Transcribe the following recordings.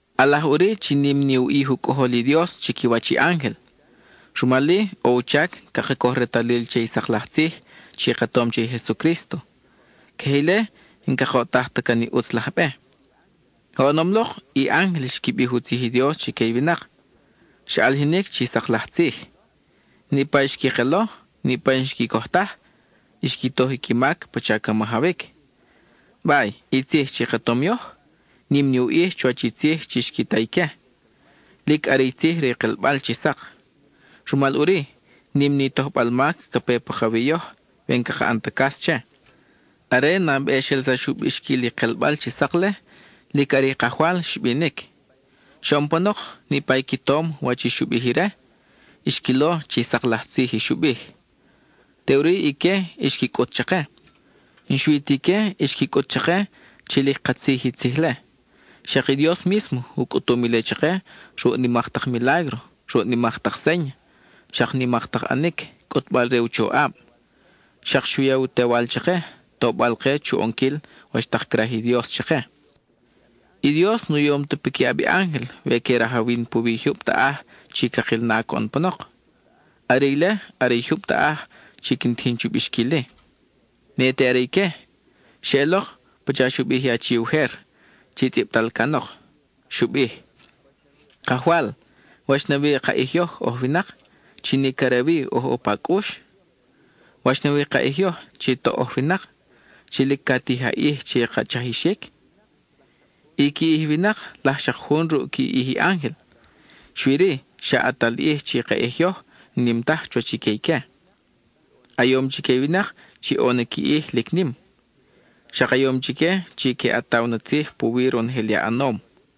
ʼAlaj ʼuri chi nim ni u ʼij i u Cʼojol i Dios chiquiwach i ángel, rumal-i ʼo u chac caka coj retalil che i sak laj tzij chi ka tom che i Jesucrísto, queje ile n-cakoʼtaj ta can i ʼutz laj be. Oʼonom lok, i ángel xqui bij u tzij i Dios chique i winak; xa ʼalijinic chi sak laj tzij. Niʼpa i xqui kelo, niʼpa i n-xqui coj taj, xqui toj i qui mac pacha ca majawic. Bay, i tzij chi ka tom yoj, nim ni u ʼij chuwach i tzij chi xqui ta ique; lic are i tzij re i kelbal chi sak. Rumal ʼuri, nim ni tojbal mac ca pe pakawi yoj we n-caka ʼan ta cas che. Are nabe xelsax u bixquil i kelbal chi sak-le, lic are i Kajwal xbinic. Xoʼon panok, niʼpa i qui tom wach i xu bij ire, xquilo chi sak laj tzij i xu bij; teʼuri ique xqui cʼut chake. N-xui ta ique xqui cʼut chake chi lic katzij i tzij-le, xak i Dios mísmo u cʼutum ile chake ruʼ nimak tak milágro, ruʼ nimak tak séña, xak nimak tak ʼanic, cʼutbal-re u choʼab; xak xu ya i u Tewal chake, tobal-ke chu ʼonquil wach tak craj i Dios chake. I Dios nu yom ta piquiʼab i ángel we que rajawin puwi i jyub taʼaj chi cakil na coʼon panok, are ile are i jyub taʼaj chi quin tijin chu bixquil-i. Ne te are ique; xeʼelok pacha xu bij i achi ujer chi tzʼibtal canok: Kajwal, ¿Wach nawi ka ʼij yoj oj winak, chi nic are wi oj ʼo pa cʼux? ¿Wach nawi ka ʼij yoj chi toʼ oj winak, chi lic ca tij a ʼij che i ka chajixic? I qui ʼij i winak laj xak jun ruʼ qui ʼij i ángel, xui-ri xa ʼatal ʼij chi i ka ʼij yoj n-nim taj chuwach i que ique. A yom chique i winak chi ʼo na qui ʼij lic nim, xak a yom chique chi que ʼataw na tzij puwi ronojel i a ʼanom.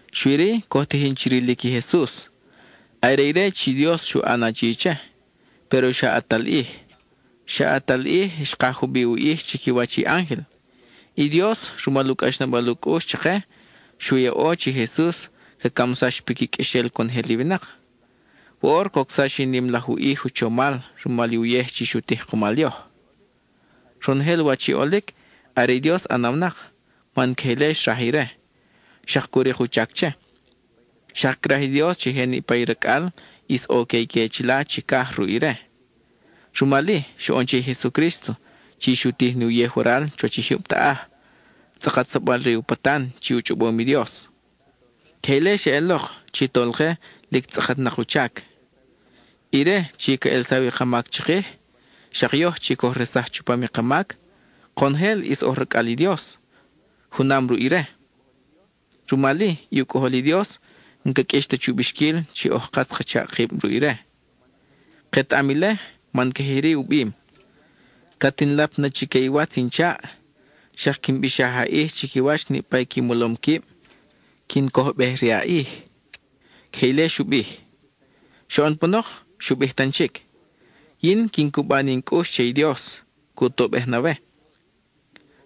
xui-ri coj tijin chi rilic i Jesus. Are ire chi i Dios xu ʼan achi che, péro xa ʼatal ʼij; xa ʼatal ʼij xkaj jubiʼ u ʼij chiquiwach i ángel. I Dios, rumal u cʼaxnabal u cʼux chake, xu yaʼo chi i Jesus ca camsax piqui qʼuexel conojel i winak. Woʼor cocsax i nim laj u ʼij u chomal rumal i uyej xu tij kumal yoj. Ronojel wach i ʼolic, are i Dios ʼanawnak, man queje ile xraj ire, xak cu rik u chac che. Xak craj i Dios chi je niʼpa i racʼal ʼis ʼo que ique chila chicaj ruʼ ire. Rumal-i xoʼon che i Jesucrísto chi xu tij ni uyej waral chuwach i jyub taʼaj, tzʼakatsabal re u patan chi u chʼobom i Dios. Queje ile xeʼelok chi Tolke lic tzʼakatnak u chac. Ire chi ca ʼelsaw i ka mac chikij, xak yoj chi coj resaj chupam i ka mac, konojel ʼis oj racʼal i Dios junam ruʼ ire. Rumal-i, i u Cʼojol i Dios n-ca qʼuix ta chu bixquil chi oj katz ka chaʼ kib ruʼ ire. Ketaʼam ile, man queje iri u bim: Cat in lap na chique i watz in chaʼ, xak quin bixaj a ʼij chiquiwach niʼpa i qui molom quib, quin cojbej-re a ʼij. (Queje ile xu bij.) Xoʼon panok, xu bij tan chic: Yin, quin cuba ni in cʼux che i Dios, cu tobej na we.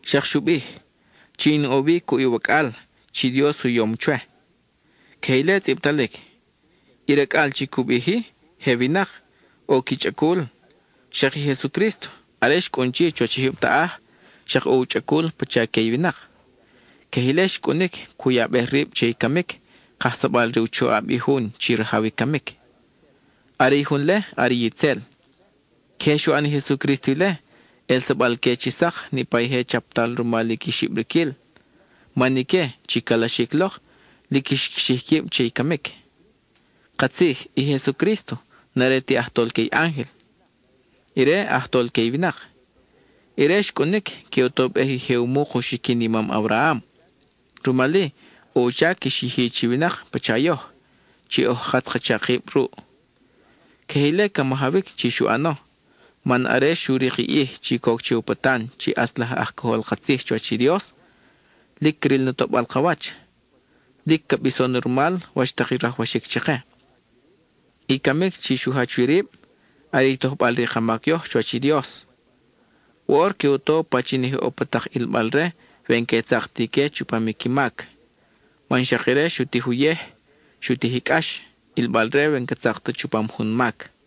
Xak xu bij: Chi in ʼo wi cuʼ i wacʼal chi i Dios u yom chwe. (Queje ile tzʼibtalic.) I racʼal chi cu bij-i, je winak, ʼo qui chʼacul; xak i Jesucrísto are xcʼun chi chuwach i jyub taʼaj, xak ʼo u chʼacul pacha que i winak. Queje ile xcʼunic cu yabej rib che i camic, kajsabal re u choʼab i jun chi rajaw i camic. Are i jun-le are itzel. Queje xu ʼan i Jesucrísto ile, ʼelsabal-que chi sak niʼpa i je chaptal rumal i qui xibriquil; man ique, chi calaxic lok, lic xqui xij quib che i camic. Katzij, i Jesucrísto n-are ti aj tolque i ángel, ire aj tolque i winak; ire xcʼunic, que u tobej i je u muk u xiquin i mam Abraham. Rumal-i, ʼo u chac xyiji chi winak pacha yoj, chi oj katz ka chaʼ kib ruʼ. Queje ile ca majawic chi xu ʼano, man are xu rik i ʼij chi coc che u patan chi ʼatz laj aj cojol ka tzij chuwach i Dios, lic cril na toʼbal ka wach, lic ca bison na rumal wach tak i rajwaxic chake. I camic chi xu jach wi rib, are i tojbal re i ka mac yoj chuwach i Dios. Woʼor que u to pachin i je ʼo pa tak ʼilbal-re we n-que tzak ti ique chupam i qui mac, man xak ire xu tij uyej, xu tij i cʼax, ʼilbal-re we n-ca tzak ta chupam jun mac.